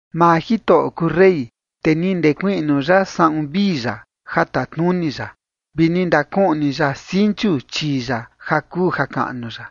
Maa Jitoꞌo kuu rey, te ni ndekuiꞌnu ya saꞌun vii ya ja tatnuni ya vi ni ndakuꞌni ya sinchu chii ya ja kuu jakaꞌnu ya,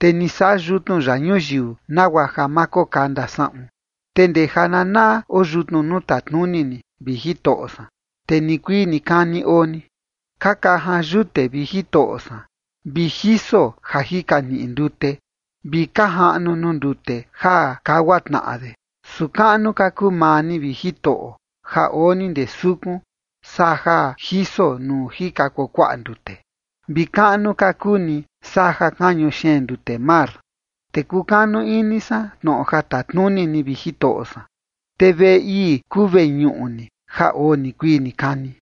te ni saꞌa yutnu ya ñuyiu nagua ja ma kokanda saꞌun. Te ndee jananaꞌa oo yutnu nuu tatnuni ni, vi Jitoꞌo san, te nikuii nikani oo ni. Ka kajan yute, vi Jitoꞌo san, vi jiso ja jika niꞌi ndute, vi ka jaꞌnu nuu ndute ja kagua tnaꞌa de. Su kaꞌnu ka kuu maa ni, vi Jitoꞌo, ja oo ni ndee sukun, saa ja jiso nuu jika kuakuaꞌa ndute, vi kaꞌnu ka kuu ni saa ja kañu xeen ndute mar. Te kukanu ini san tnoꞌo ja tatnuni ni, vi Jitoꞌo san, te veꞌe ii kuu veñuꞌu ni ja oo nikuii nikani.